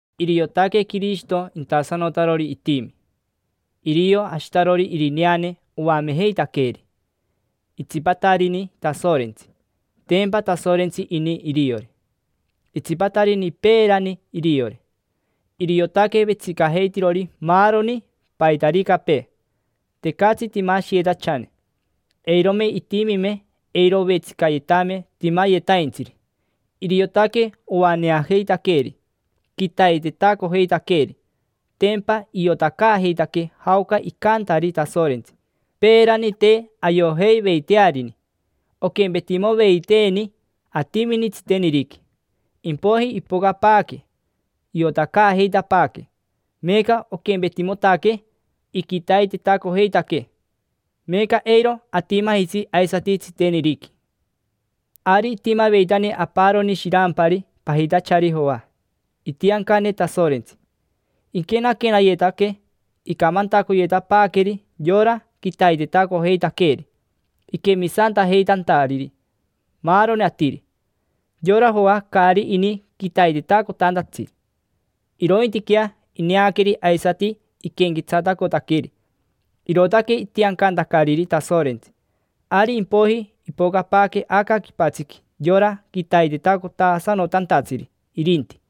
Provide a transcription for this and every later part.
Iriotaque Quirishito intasanotarori itimi: irio Ashitarori Irineane oamejeitaqueeri. Itsipatarini Tasorentsi, tempa Tasorentsi ini iriori. Itsipatarini peerani iriori. Iriotaque vetsicajeitirori maaroni, paitaricapee. Tecatsi imashiyetachane: eirome itimime eiro ovetsicayetame timayetaintsiri. Iriotaque oaneajeitaqueeri, quitaitetacojeitaqueeri: tempa iotacaajeitaquee jaoca icantari Tasorentsi. Peerani te ayojeiveitearini, oquempetimoveiteeni atimini tsiteniriqui; impoiji ipocapaaque, iotacaajeitapaaquee, meeca oquempetimotaquee iquitaitetacojeitaquee. Meeca eiro atimajitsi aisati tsiteniriqui. Ari itimaveitani aparoni shirampari pajitachari Joa, itiancane Tasorentsi. Iquenayetanaque, icamantacoyetapaaqueri yora quitaitetacojeitaqueeri, iquemisantajeitantariri maaroni atiri. Yora Joa caari ini quitaitetacotantatsi, irointiquea ineaqueri aisati iquenquetsatacotaqueri. Irootaque itiancantacariri Tasorentsi. Ari impoiji ipocapaaque aca quipatsiqui yora quitaitetacotasanotantatsiri irinti,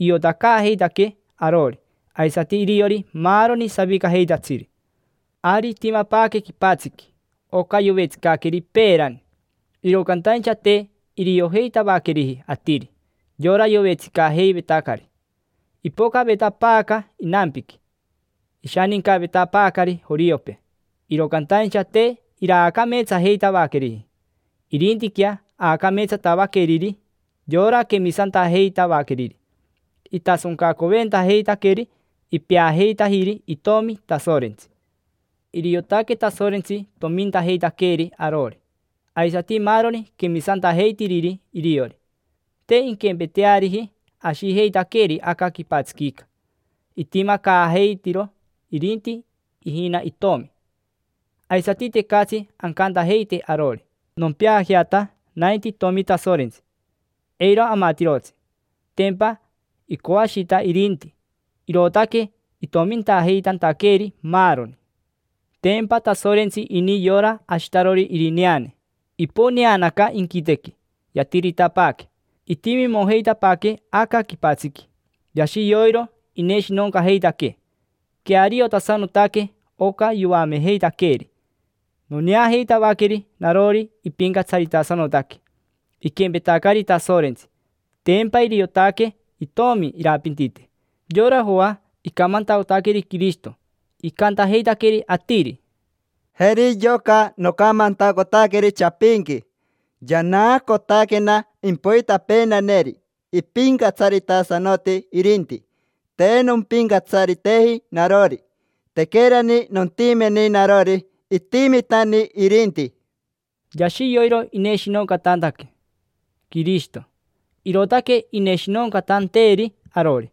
iotacaajeitaquee arori, aisati iriori maaroni savicajeitatsiri. Ari itimapaaque quipatsiqui, oca yovetsicaqueri peerani, iro cantaincha te iriojeitavaqueriji atiri, yora yovetsicajeivetacari. Ipocavetapaaca inampiqui, ishanincavetapaacari joriopee, iro cantaincha te iraacameetsajeitavaqueriji. Irintiquea aacameetsatavaqueriri, yora quemisantajeitavaqueriri: itasoncacoventajeitaqueri, ipeajeitajiri itomi Tasorentsi. Iriotaque Tasorentsi tomintajeitaqueeri arori, aisati maaroni quemisantajeitiriri iriori. Te inquempeteariji ashijeitaqueeri aca quipatsiquica, itimacaajeitiro irinti ijina itomi. Aisati tecatsi ancantajeite arori: “Nompeajeata nainti itomi Tasorentsi”, eiro amatirotsi. Tempa icoashita irinti, irootaque itomintajeitantaqueeri, maaroni. Tempa Tasorentsi ini yora Ashitarori Irineane: iponeanaca inquitequi, yatiritapaaque, itimimojeitapaaquee aca quipatsiqui. Yashi yoiro ineshinoncajeitaquee, queariotasanotaque oca yoamejeitaqueeri. Noneajeitavaqueri narori ipincatsaritasanotaque, iquempetacari Tasorentsi; tempa iriotaque itomi irapintite. Yora Joa icamantacotaqueri Quirishito, icantajeitaqueri atiri: —Jeri yoca nocamantacotaqueri chapinqui: “Yanaacotaquena impoitapeenaneri, ipincatsaritasanoti irinti. Te nompincatsariteji narori. Tequerani nontimeni narori, itimitani irinti”. Yashi yoiro ineshinoncatantaque Quirishito, irootaque ineshinoncatanteeri arori.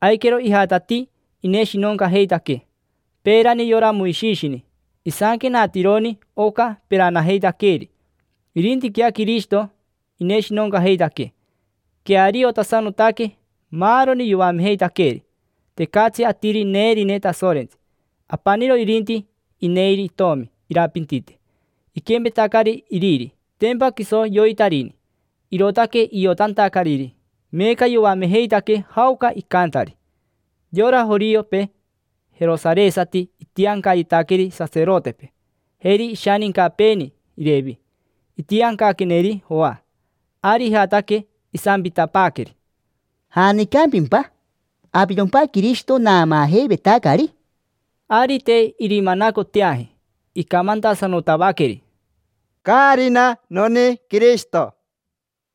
Aiquero ijatatii ineshinoncajeitaquee. Peerani yora Moishishini, isanquenatironi oca peranajeitaqueeri; irintiquea Quirishito ineshinoncajeitaquee, queariotasanotaque maaroni yoamejeitaqueeri. Tecatsi atiri neerine Tasorentsi, apaniro irinti ineiri itomi irapintite. Iquempetacari iriri, tempa quiso yoitarini, irootaque iotantacariri: meeca yoamejeitaquee jaoca icantari. Yora joriopee jerosaresati itiancayetaqueri saserotepee, jeri ishanincapeeni Irevi. Itiancaqueneri Joa, ari ijataque. Isampitapaaqueri: —¿Janicampimpa? ¿Avirompa Quirishito naamaajeivetacari? Ari te irimanacoteaji. Icamantasanotavaqueri: —Caarina noni Quirishito.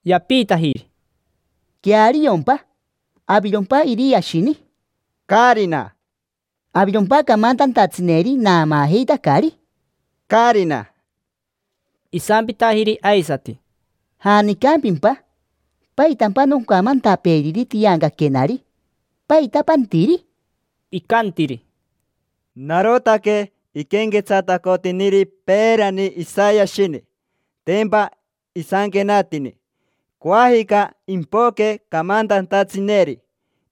Yapiitajiri: —¿Queariompa? ¿Avirompa Iriashini? —Caarina. —¿Avirompa camantantatsineri naamaajeitacari? —Caarina. Isampitajiri aisati: —¿Janicampimpa? ¿Paitampa noncamantapeeriri tiancaquenari? ¿Paita pantiri? Icantiri: —Narotaque iquenquetsatacotiniri peerani Isayashini, tempa isanquenatini: “Coajica impoque camantantatsineri,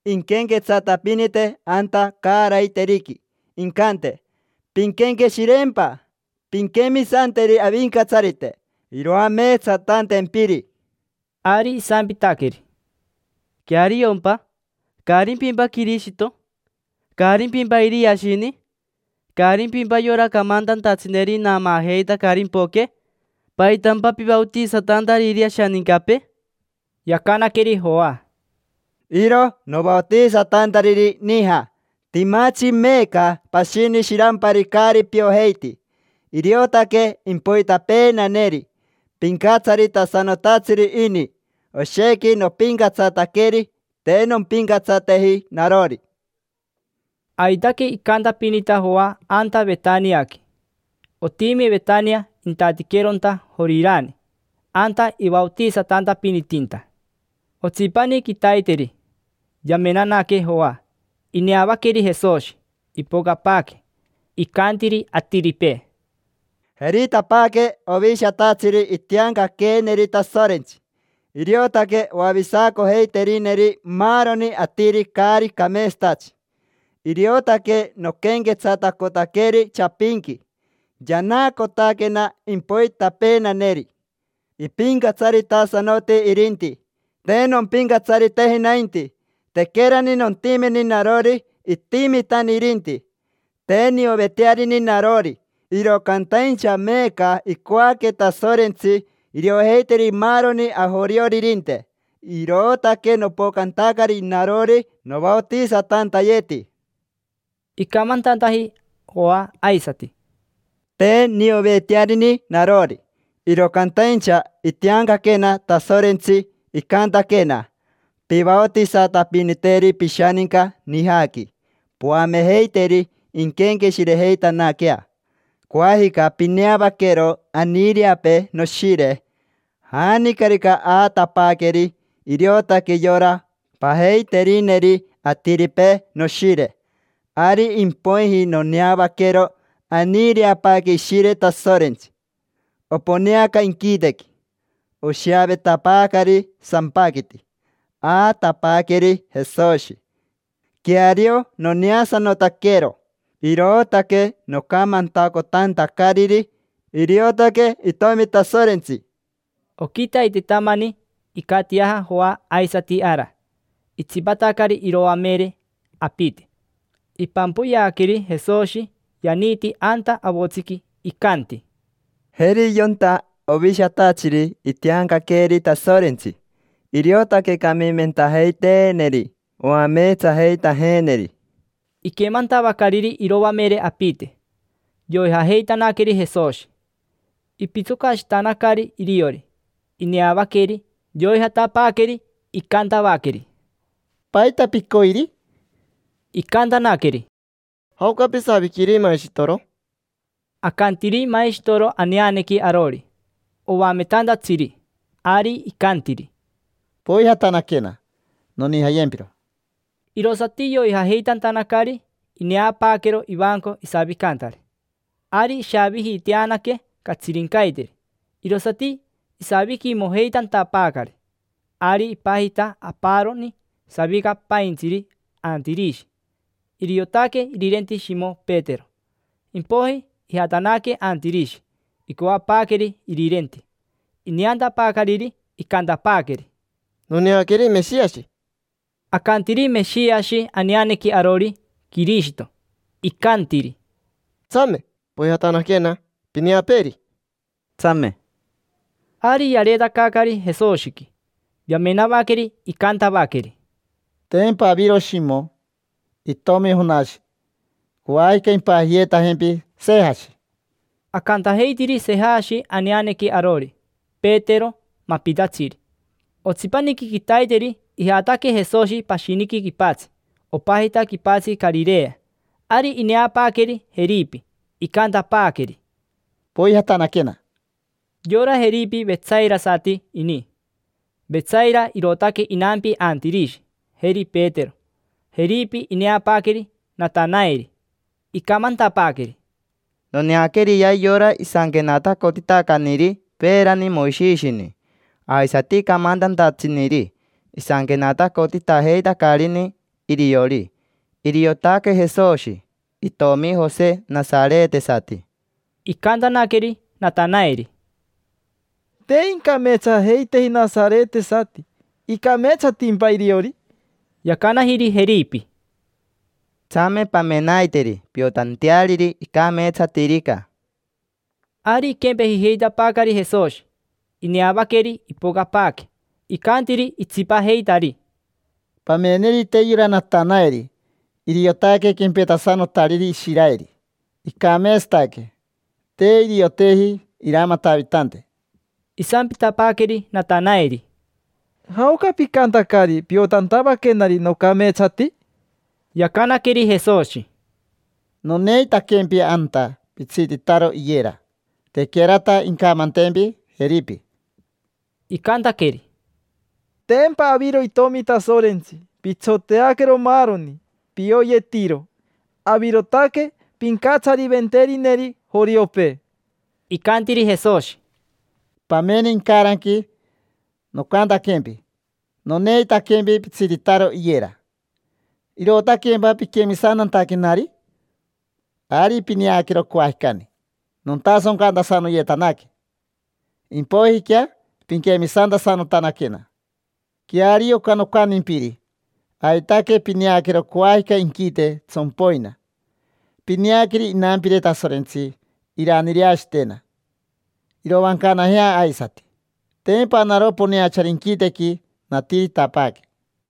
inquenquetsatapinite anta caaraiteriqui, incante: ‘Pinquenqueshireempa, pinquemisanteri Avincatsarite iroameetsatantempiri’”. Ari isampitaqueri: —¿Queariompa? ¿Caarimpimpa Quirishito? ¿Caarimpimpa Iriashini? ¿Caarimpimpa yora camantantatsineri naamaajeitacari impoque? ¿Paitampa pivaotisatantariri ashanincapee? Yacanaqueri Joa: —Iro novaotisatantariri nija. Timatsi meeca pashini shirampari caari piojeiti. Iriotaque impoitapeenaneri, pincatsaritasanotatsiri ini. Oshequi nopincatsataqueri, te nompincatsateji narori. Aitaque icantapinita Joa anta Vetaniaqui. Otimi Vetania intatiqueronta Jorirani. Anta ivaotisatantapinitinta. Otsipani quitaiteri yamenanaque Joa, ineavaqueri Jesoshi, ipocapaaque. Icantiri atiripee: —Jeritapaaque ovishatatsiri itiancaqueeneri Tasorentsi. Iriotaque oavisacojeiterineri maaroni atiri caari cameetsatatsi. Iriotaque noquenquetsatacotaqueri chapinqui: “Yanaacotaquena impoitapeenaneri, ipincatsaritasanoti irinti. Te nompincatsariteji nainti. Tequerani nontimeni narori, itimitani irinti”. Te niovetearini narori, iro cantaincha meeca icoaque Tasorentsi iriojeiteri maaroni ajorioririnte. Irootaque nopocantacari narori novaotisatantayeti. Icamantantaji Joa aisati: —Te niovetearini narori. Iro cantaincha itiancaquena Tasorentsi, icantaquena: “Pivaotisatapiniteri pishaninca nijaqui, poamejeiteri inquenqueshirejeitanaquea. Coajica pineavaquero aniireapee noshire. Janicarica aatapaaqueri, iriotaque yora pajeiterineri atiripee noshire”. Ari impoiji noneavaquero aniireapaaque Ishire Tasorentsi, oponeanaca inquitequi. Oshiavetapaacari sampaquiti: aatapaaqueri Jesoshi. Queario noneasanotaquero. Irootaque nocamantacotantacariri: “Iriotaque Itomi Tasorentsi”. Oquitaitetamani icatiaja Joa aisati ara, itsipatacari iroamere apite. Ipampoyeaqueri Jesoshi yaniiti anta avotsiqui. Icanti: —Jeri yonta ovishatatsiri itiancaqueeri Tasorentsi, iriotaque camimentajeiteeneri oameetsajeitajeeneri. Iquemantavacariri iroamere apite, yoijajeitanaqueri Jesoshi. Ipitsocashitanacari iriori, ineavaqueri yoijatapaaqueri. Icantavaqueri: —¿Paita picoiri? Icantanaqueri: —¿Jaoca pisaviquiri maishitoro? Acantiri maishitoro aneanequi arori: oametantatsiri. Ari icantiri: —Poijatanaquena, nonijayempiro. Irosati yoijajeitantanacari, ineapaaquero ivanco isavicantari. Ari ishavijiiteanaque catsirincaiteri, irosati isaviquimojeitantapaacari. Ari ipajita aparoni savicapaintsiri Antirishi, iriotaque irirenti Shimo Petero. Impoiji ijatanaque Antirishi, icoapaaqueri irirenti. Ineantapaacariri, icantapaaqueri: —Noneaqueri Meshiashi. Acanti Meshiashi aneanequi arori: Quirishito. Icantiri: —Tsame, poijatanaquena, pineapeeri. —Tsame. Ari yareetacaacari Jesoshiqui. Yamenavaqueri, icantavaqueri: —Tempa aviro Shimo, itomi Jonashi. Coajica impajiyeetajempi: Sejashi. Acantajeitiri Sejashi aneanequi arori: Petero, mapitatsiri. Otsipaniqui quitaiteri ijataque Jesoshi pashiniqui quipatsi. Opajita quipatsi Carirea. Ari ineapaaqueri Jeripi, icantapaaqueri: —Poijatanaquena. Yora Jeripi vetsairasati ini. Vetsaira irootaque inampi Antirishi, jeri Petero. Jeripi ineapaaqueri Natanaeri. Icamantapaaqueri: —Noneaqueriyea yora isanquenatacotitacaniri peerani Moishishini. Aisati camantantatsiniri isanquenatacotitajeitacarini iriori. Iriotaque Jesoshi, itomi Jose nasaretesati. Icantanaqueri Natanaeri: —Te incameetsajeiteji nasaretesati. ¿Icameetsatimpa iriori? Yacanajiri Jeripi: —Tsame, pamenaiteri, piotanteariri icameetsatirica. Ari iquempejijeitapaacari Jesoshi, ineavaqueri ipocapaaque, icantiri itsipajeitari: —Pamenerite yora Natanaeri. Iriotaque quempetasanotariri Ishiraeri: icameetsataque, te irioteji iramatavitante. Isampitapaaqueri Natanaeri: —¿Jaoca picantacari piotantavaquenari nocameetsati? Yacanaqueri Jesoshi: —Noneitaquempi anta pitsititaro iyera, tequerata incamantempi Jeripi. Icantaqueri: —Tempa aviro itomi Tasorentsi: pitsoteaquero maaroni, pioyetiro. Avirotaque pincatsariventerineri joriopee. Icantiri Jesoshi: —Pamene, incaranqui nocantaquempi: “Noneitaquempi pitsititaro iyera”. ¿Irootaquempa piquemisantantaquenari? Ari pineaquero coajicani nontasoncantasanoyetanaque, impoijiquea pinquemisantasanotanaquena. Queario oca nocantimpiri. Aitaque pineaquero coajica inquite tsompoina. Pineaqueri inampire Tasorentsi iraniireashitena, iroancanajea aisati. Tempa naro poneachari inquitequi, natiritapaaque.